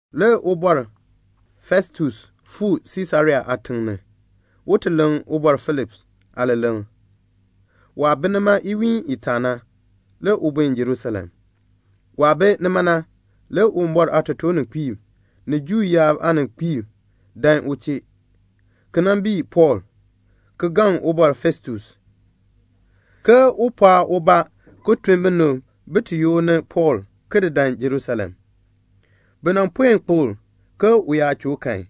Le Ubɔr Festus fuu Siisarea aatiŋ ni, un ti leŋ Ubɔr Feliks aaleleŋ. Waah bi nima iwiin itaa na, le u buen Jerusalem. Waah bi nima na, le Uwumbɔr aatotoorninkpiib ni Juu yaab aaninkpiib dan u chee, ki nan bii Pɔɔl, ki gaŋ Ubɔr Festus ke un pɔɔn ubaa ki tun binib bin ti yoor ni Pɔɔl ki dan Jerusalem. Bi nan puen kpokl ke u yaa choo kan,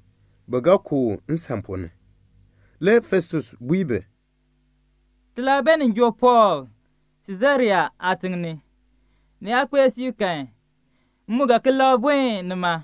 bi ga ku u nsan ponn ni. Le Festus bui bi, "Ti laa beenin joo Pɔɔl Siisarea aatiŋ ni. Ni yaa kpee siib kan, m mu ga ki labr buen nima.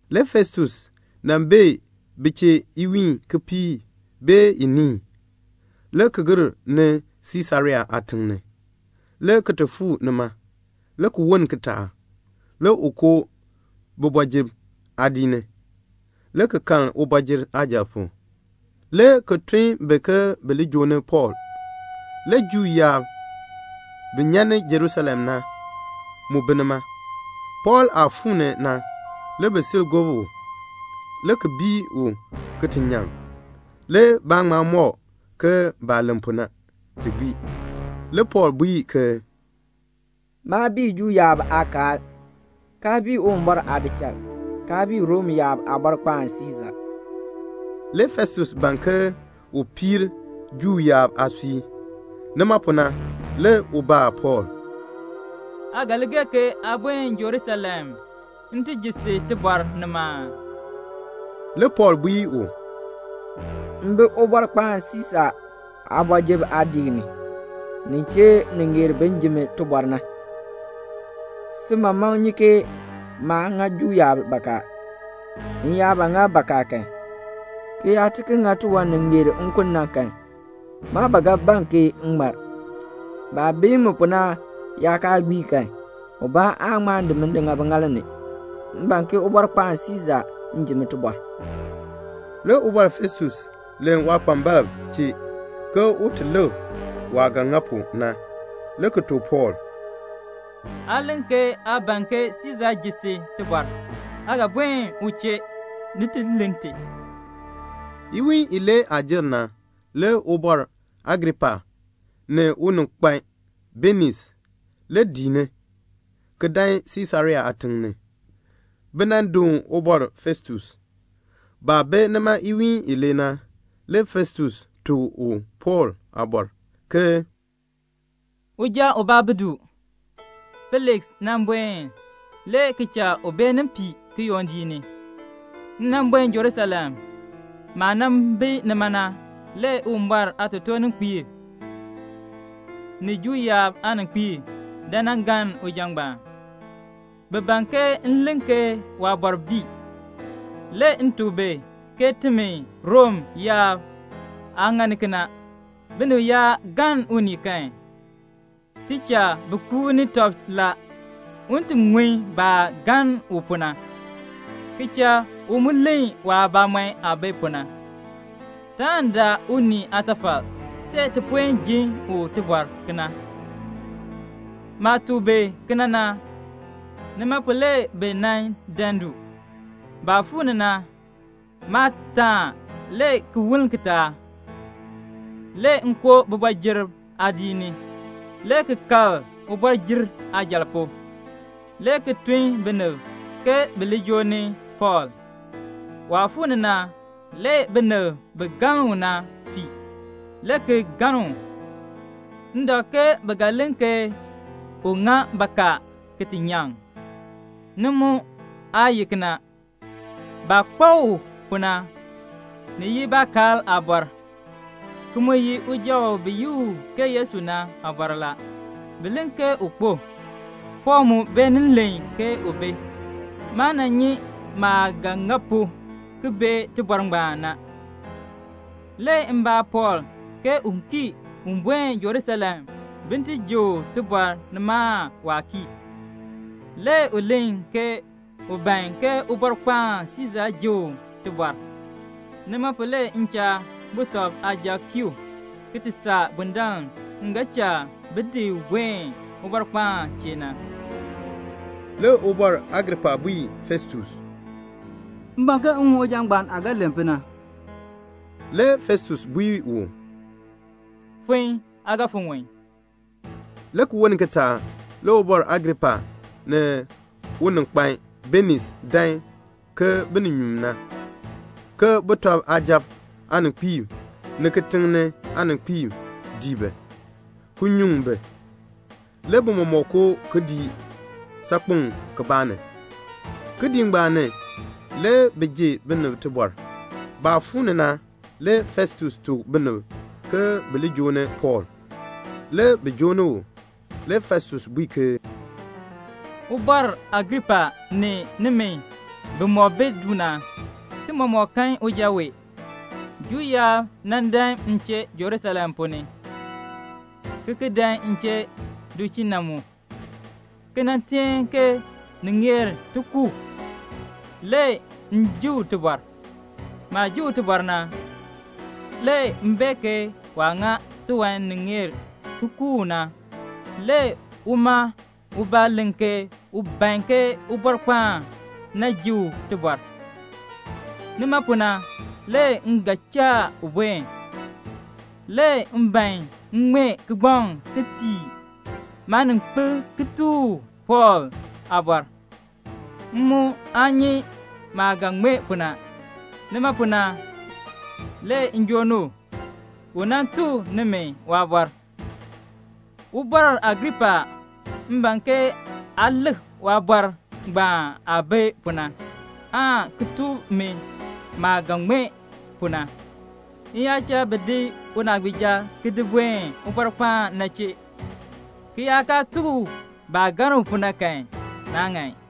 Le Festus nan bee bi chee iwiin kipiik aan iniin, le ki gir ni Siisarea aatiŋ ni, le ki ti fuu nima. Le ki woln kitaak, le u koo kooti ni, le ki kal ubɔjir aajal pu, le ki tun bi ke bi li joo ni Pɔɔl. Le Juu yaab bi nyan ni Jerusalem na, mu bi nima. Pɔɔl aah fuu ni na, le bi sil gob u, le ki bii u ki ti nyaŋ. Le baa ŋma mɔk ke baah len pu na, ti gbii. Le Pɔɔl bui ke "Maa bii Juu yaab aakaal, kaa bii Uwumbɔr aadichal, kaa bii Rom yaab Aabɔrkpaan Siisa." Le Festus ban ke un piir Juu yaab aasui. Nima pu na, le u baa Pɔɔl, "Aa ga li gee ke aa buen Jerusalem m ti ji si tibɔr nima aa?" Le Pɔɔl bui u, "M bi Ubɔrkpaan Siisa aakooti ni, nin chee ni ŋeer bin ji mi tibɔr na. Si mamaŋ nyi ke maa ŋa Juu yaab bakaa. M yaa ba ŋa bakaa kan, ki yaa ti ki ŋa tiwan ni ŋeer nkun na kan, maa ba ga ban ke m ŋmar. Baah bii mi pu na yaa kaa gbii kan, ubaa aan ŋma di mi ŋa biŋaal ni. M ban ke Ubɔrkpaan Siisa ji mi tibɔr." Le Ubɔr Festus len waakpambalb chee ke un ti lik waah ga ŋa pu na, le ki tuk Pɔɔl, "Aa len ke aa ban ke Siisa ji si tibɔr. Aa ga buen u chee, ni ti len ti." Le iwiin ibaa jer. Le Ubɔr Agripa ni uninkpan Beniis le dii ni, ki dan Siisarea aatiŋ ni, bi nan doon Ubɔr Festus. Baah bi nima iwiin ilee na, le Festus tuk u Pɔɔl aabɔr, ke "Uja ubaa bi du. Feliks nan buen le ki cha u beenin pii kiyondiik ni. M nan buen Jerusalem. Maah nan bi nima na, le Uwumbɔr aatotoorninkpiib, ni Juu yaab aaninkpiib dan nan galn uja ngbaan. Bi ban ke m len ke waabɔr bii. Le m tuk bi ke timi Rom yaab aa ŋani kena. Binib yaa galn unii kan, ti cha bi kuuni tɔb la, un ti ŋun baah galn u pu na, ki cha u mu len waabamɔn aah bi pu na. Taan daa unii aatafal see ti puen ji u tibɔr kena. Maah tuk bi kena na, nima pu le bi nan dan du. Baah fuu ni na, maa taan, le ki woln kitaak, le m koo kooti ni, le ki kal ubɔjir aajal pu, le ki tun binib ke bi li joo ni Pɔɔl. Waah fuu ni na, le binib bi galn u na fii, le ki galn u. M dak ke bi ga len ke u ŋa bakaa ki ti nyaŋ. Ni mu aa ye kena. Baah kpak u pu na, ni ye baakaal aabɔr, ki mu ye uja u bi yi u ke Yesu na aabɔr la. Bi len ke u kpo. Pɔɔl mu beenin len ke u bi. Maa nan nyi maah ga ŋa pu ki bee tibɔr ngbaan na. Le m baa Pɔɔl ke u kii un buen Jerusalem bin ti ji u tibɔr nima aan waa kii? Le u len ke u ban ke Ubɔrkpaan Siisa ji u tibɔr. Nima pu le m cha sujatiib kii u, ki ti saa bundaln m ga cha bi di u buen Ubɔrkpaan chee na." Le Ubɔr Agripa bui Festus, "M ban ke m ŋun uja ngbaan aah ga len pu na." Le Festus bui u, "Fon, aa ga fon ŋun." Le ki woln kitaak le Ubɔr Agripa ni uninkpan Beniis dan ke bininyuun na. Le sujatiib aaninkpiib ni kitiŋ ni aaninkpiib dii bi, ki nyuŋ bi. Le bi mɔmɔk koo kidiik saakpeŋ kibaa ni. Kidiik ngbaan ni, le bi ji binib tibɔr. Baah fuu ni na, le Festus tuk binib ke bi li joo ni Pɔɔl. Le bi joo ni u. Le Festus bui ke, "Ubɔr Agripa ni nimi bimɔk bi du na, ti mɔmɔk kan uja wee. Juu yaab nan dan m chee Jerusalem ponn ni, ki ki dan m chee du chee na mu, ki nan teen ke ni ŋeer ti ku u. Le m ji u tibɔr. Maah ji u tibɔr na, le m bee ke waa ŋa tiwan ni ŋeer ti ku u na. Le uma ubaa len ke u ban ke Ubɔrkpaan na ji u tibɔr. Nima pu na, le m ga cha u buen. Le m ban m ŋmee kigbaŋ ki tii maaninkpil ki tuk u Pɔɔl aabɔr. M mu aa nyi maah ga ŋmee pu na. Nima pu na le m joo ni u, u nan tuk nimi waabɔr. Ubɔr Agripa, m ban ke aa lik waabɔr ngbaan aah bi pu na, aan ki tuk mi maah ga ŋmee pu na. M yaa cha bi di unaagbiija ki di buen Ubɔrkpaan na chee, ki yaa kaa tuk u baah galn u pu na kan, naa ŋan."